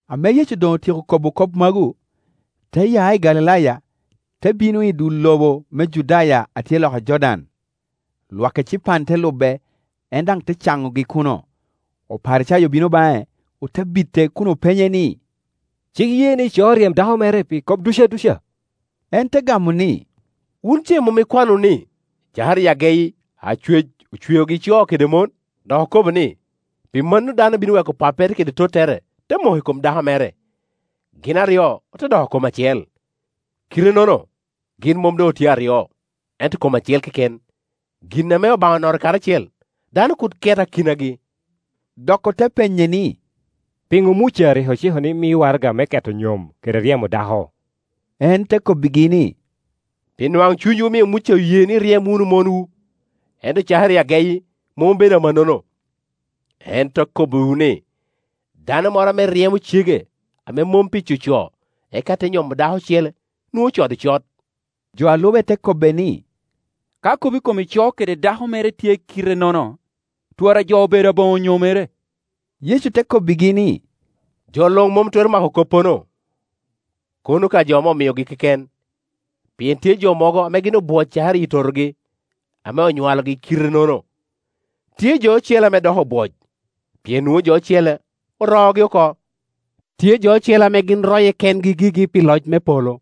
Ame Yecu doŋ otyeko kobo kop magu, te ya i Galilaya te bino i dul lobo me Judaya a tye loka Jordan. Lwak ecipan te lube, en daŋ te caŋogi kuno. Oparicayo obino baŋe, ote bite kun openye ni, “Cik ye ni ico ryem dako mere pi kop duc aduca?” En te gamo ni, “Wun ce mom ikwano wunu ni, cakere i ageyi Acwec ocweogi co kede mon? Dok okobo ni, ‘Pi mano dano bino weko pappere kede tottere, te moko i kom dako mere, gin aryo ote doko kom acel.’ Kite-nono, gin mom doŋ otye aryo, ento kom acel keken. Gin ame Obaŋa onoto karacel dano kur ket akinagi.” Dok ote penye ni, “Piŋo Muca rik ociko ni mi waraga me keto nyom, kede ryemo dako?” En te kobbigi ni, “Pi nwaŋ cunywu omio Muca oye ni iryem wunu monwu, ento cakere i ageyi mom obedo amannono. Kor. 7.10-11Ento akobbiwu ni, dano moro ame ryemo cege, ame mom pi coco, eka te nyomo dako ocele, nwoŋo ocodo cot.” Jo a lube te kobbe ni, “Ka kop i kom ico kede dako mere tye kite-nono, twara jo obedo aboŋo nyomere.” Yecu te kobbigi ni, “Jo luŋ mom twero mako koppono, kono ka jo ame omiogi keken. Pien tye jo mogo ame gin obwoc cakere iyi totogi, ame onywalogi kite-nono; tye jo ocele ame doko obwoc pien nwoŋo jo ocele oroogi oko; tye jo ocele ame gin roye kengi gigi pi loc me polo.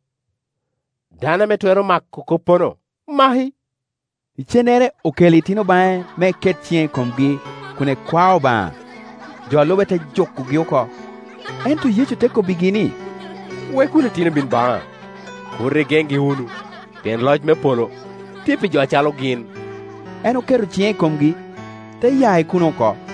Dano ame twero mako koppono, maki.” Icennere okelo itino baŋe me eket ciŋe i komgi kun ekwao Obaŋa. Jo a lube te jukogi oko. Ento Yecu te kobbigi ni, “Wek wunu itino bin baŋa, kur igeŋgi wunu, pien loc me polo tye pi jo acalo gin.” En oketo ciŋe i komgi, te ya i kuno oko.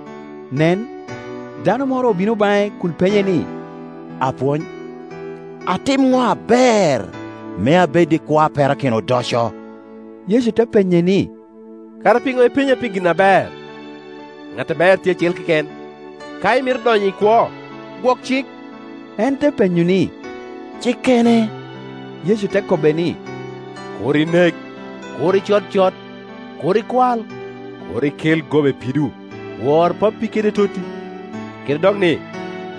Nen, dano moro obino baŋe kun penye ni, “Apwony, atim ŋo aber me abed i kwo a perakino odoco?” Yecu te penye ni, “Kara piŋo ipenya pi gin aber? Ŋat aber tye acel keken. Ka imito donyo i kwo, gwok cik.” En te penyo ni, “Cikkene?” Yecu te kobbe ni, “Kur inek, Kur icod cot Kur ikwal, Kur ikel goba i pido: Wor pappi kede totti, kede dok ni,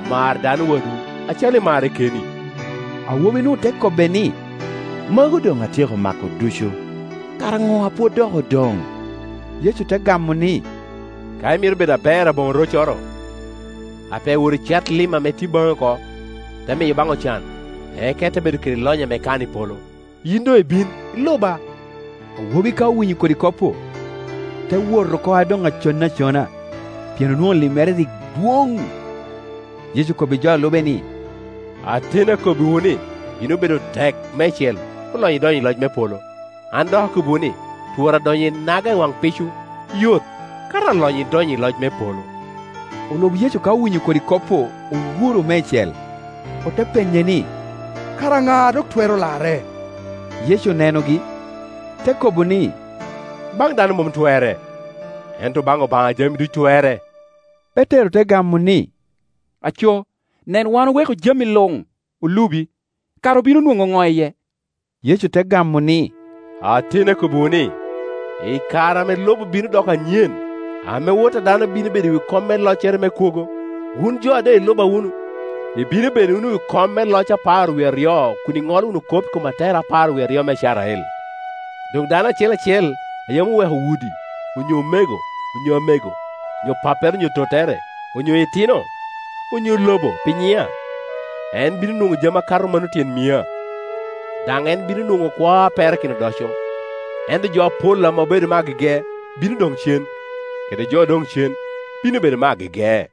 Mar dano wadwu acalo imarre keni.” Awobi-nu te kobbe ni, “Magu doŋ atyeko mako ducu; kara ŋo a pwod dok odoŋ?” Yecu te gamo ni, “Ka imito bedo aber aboŋo roccoro, ape wot icat lim a tye baŋi oko, ite miyo baŋ ocan, eka ite bedo kede lonyo ame ikano i polo; yin doŋ ibin, iluba.” Awobi ka owinyo kodi kop-pu, te wot oko a doŋ aconne acona, pien onwoŋo limmere rik dwoŋ. Yecu okobbi jo a lube ni, “Ateni akobbiwu ni, bino bedo tek meicel, olonyo idonyo i loc me polo. An dok akobbiwu ni, twara donyo inaga i waŋ pico yot, kato alonyo idonyo i loc me polo.” Olub Yecu ka owinyo kodi kop-pu owuro meicel, ote penye ni, “Kara ŋa a dok twero larre?” Yecu onenogi, te kobo ni, “Baŋ dano mom twerre, ento baŋ Obaŋa jami ducu twerre.” Petero te gamo ni, “Aco, nen wan oweko jami luŋ, olubi; kara obino nwoŋo ŋo iye?” Yecu te gamo ni, “Ateni akobbiwu ni, i kare ame lobo bino doko anyen, ame Wot a dano bino bedo i wi kom me loccere me kwogo, wun jo a doŋ iluba wunu ibino bedo wunu i wi kom me loc apar wie aryo kun iŋolo wunu kop i kom atekere apar wie aryo me Icrael. Doŋ dano acel acel a yam oweko udi onyo omego, onyo amego, onyo pappere onyo tottere, onyo itino, onyo lobo pi nyiŋa, en bino nwoŋo jami akato mano tyen mia, daŋ en bino nwoŋo kwo a perakino odoco. Ento jo apol ame obedo me agege bino doŋ cen, kede jo odoŋ cen bino bedo me agege.